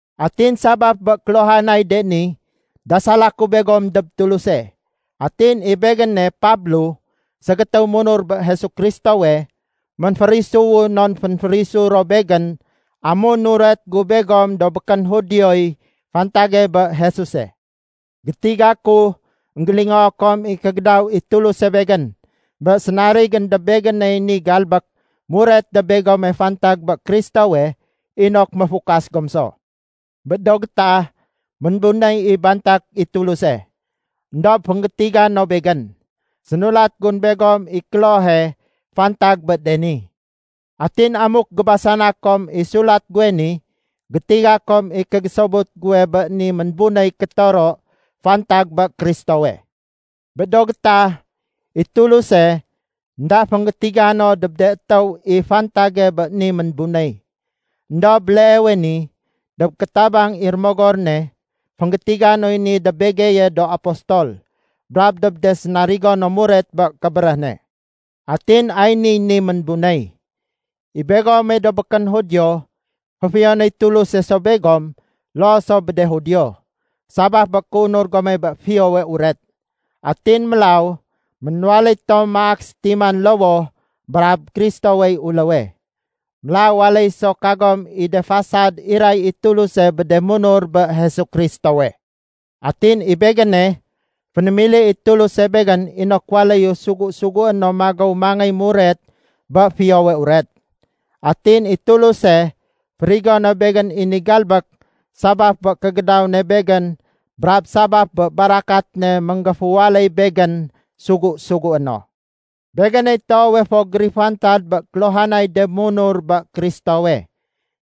Atin sabaf bé kéluhanay de ni, dasala ku begom dob Tuluse. Atin i begéne Pablo ségétéw munur bé Jesu Kristowe, ménférisuwu non fénférisu ro begén amun nuret gu begom do békén Judioy fantage bé Jesuse. Gétiga ku énggélingoo kom i kégédaw i Tuluse begén bé sénarigén dob begéney ni galbék muret dob begome fantag bé Kristowe inok méfukas gom so. Bé do gétah, ménbunéy i bantak i Tuluse. Endob fénggétiga no begén. Sénulat gun begom i klohe fantag bé de ni. Atin amuk gébasana kom i sulat guwe ni, gétiga kom i kégésobut guwe bé ni ménbunéy kétoro fantag bé Kristowe. Bé do gétah, i Tuluse énda fénggétiga no dob de étéw i fantage bé ni ménbunéy. Endob béleewe ni, dob kétabang i Rémogor ne, fénggétiga noy ni dob begeye do apostol brab dob de sénarigo no muret bé kébéréh ne. Atin ay niy ni ménbunéy. I begome do békén Judio, féfiyonéy Tuluse so begom loo so bé de Judio, sabaf bé kéunur gome bé Fiyowe Uret. Atin mélaw ménwaléy tom maak sétiman lowoh brab Kristowey uléwe. Mélaw waléy so kagom i de fasad iray i Tuluse bé de munur bé Jesu Kristowe. Atin i begéne, fénémili i Tuluse begén inok waléyu sugu-sugué no magéw mangéy muret bé Fiyowe Uret. Atin i Tuluse férigo no begén i ni galbék sabaf bé kégédaw ne begén brab sabaf bé barakat ne ménggéféwaléy begén sugu-sugué no. Begéney toowe fo gérifantad bé kéluhanay de munur bé Kristowe.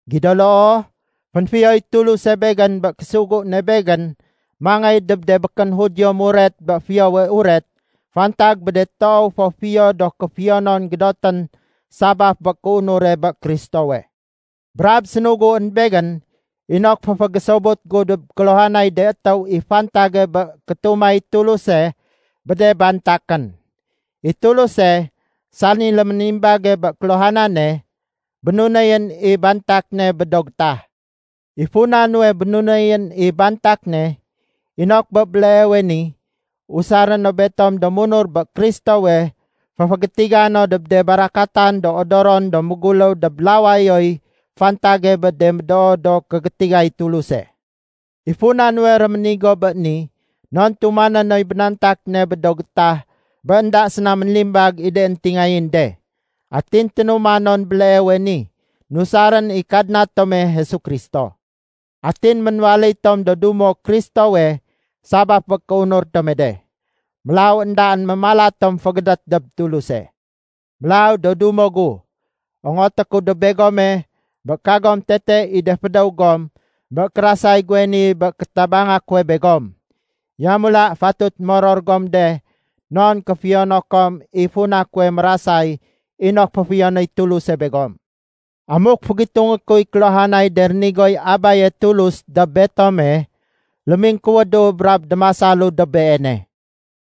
Gido loo, fénfiyoy Tuluse begén bé késugu ne begén mangéy dob de békén Judio muret bé Fiyowe Uret fantag bé de toow fo fiyo do kéfiyonon gédotén sabaf bé kéunure bé Kristowe. Brab sénuguén begén inok féfégésobut gu dob kéluhanay de étéw i fantage bé kétumay Tuluse bé de bantakén. I Tuluse, sani léménimbage bé kéluhanane, bénunéyén i bantak ne bé do getah. I funa nuwe bénunéyén i bantak ne, inok bé béleewe ni usaré no betom do munur bé Kristowe féfégétiga no dob de barakatan do odoron do méguléw dob lawayoy fantage bé de médoo do kégétigay Tuluse. I funa nuwe réménigo bé ni, non tumané noy bénantak ne bé do gétah bé énda séna ménlimbag i de éntingayén de. Atin ténuma non béleewe ni nusarén i Kadna tome Jesu Kristo. Atin ménwaléy tom do dumo Kristowe sabaf bé kéunur tome de. Mélaw éndaén mémala tom fégédét dob Tuluse. Mélaw, do dumo gu, ongoté ku dob begome, bé kagom tete i de fédéw gom bé kérasay guwe ni bé kétabanga kuwe begom. Yamula fatut moror gom de non kéfiyono kom i funa kuwe mérasay inok féfiyonéy Tuluse begom. Amuk fégitungé kuy kéluhanay de rénigoy Abaye Tulus dob betome, lémingkuwédu brab démasalu dob Beene.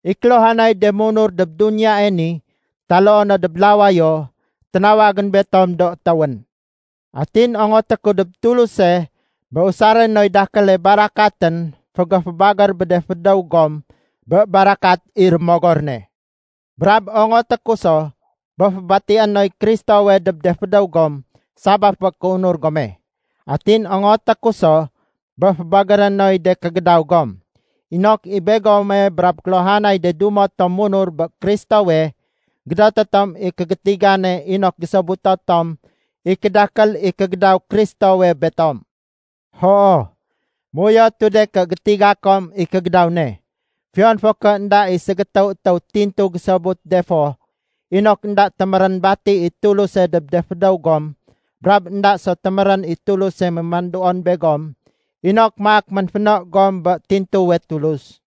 I kéluhanay de munur dob duniyae ni taloo no dob lawayo, ténawagén betom do étéwén. Atin ongoté ku dob Tuluse bé usaré noy dakéle barakatén fégéfébagér bé de fédéw gom bé barakat i Rémogor ne. Brab ongoté ku so bé fébatié noy Kristowe dob de fédéw gom sabaf bé kéunur gome. Atin ongoté ku so bé fébagéré noy de kégédaw gom, inok i begome brab kéluhanay de dumo tom munur bé Kristowe gédoté tom i kégétigane inok gésobuto tom i kédakél i kégédaw Kristowe betom. Hoo, méuyotu de ké gétiga kom i kégédaw ne, fiyon fo ké énda i ségétéw étéw tintu gésobut de fo, inok énda témérén bati i Tuluse dob de fédéw gom brab énda so témérén i Tuluse mémanduon begom inok maak ménféno gom bé tintuwe Tulus.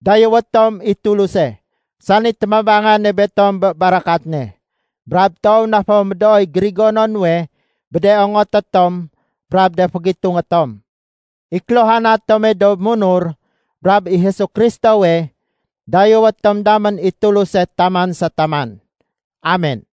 Dayéwé tom i Tuluse, sani témabangane betom bé barakat ne, brab toow na fo médooy gérigono nuwe bé de ongoté tom brab de fégitungé tom. I kéluhana tome do munur brab i Jesu Kristowe, dayéwé tom damén i Tuluse taman sa taman. Amen.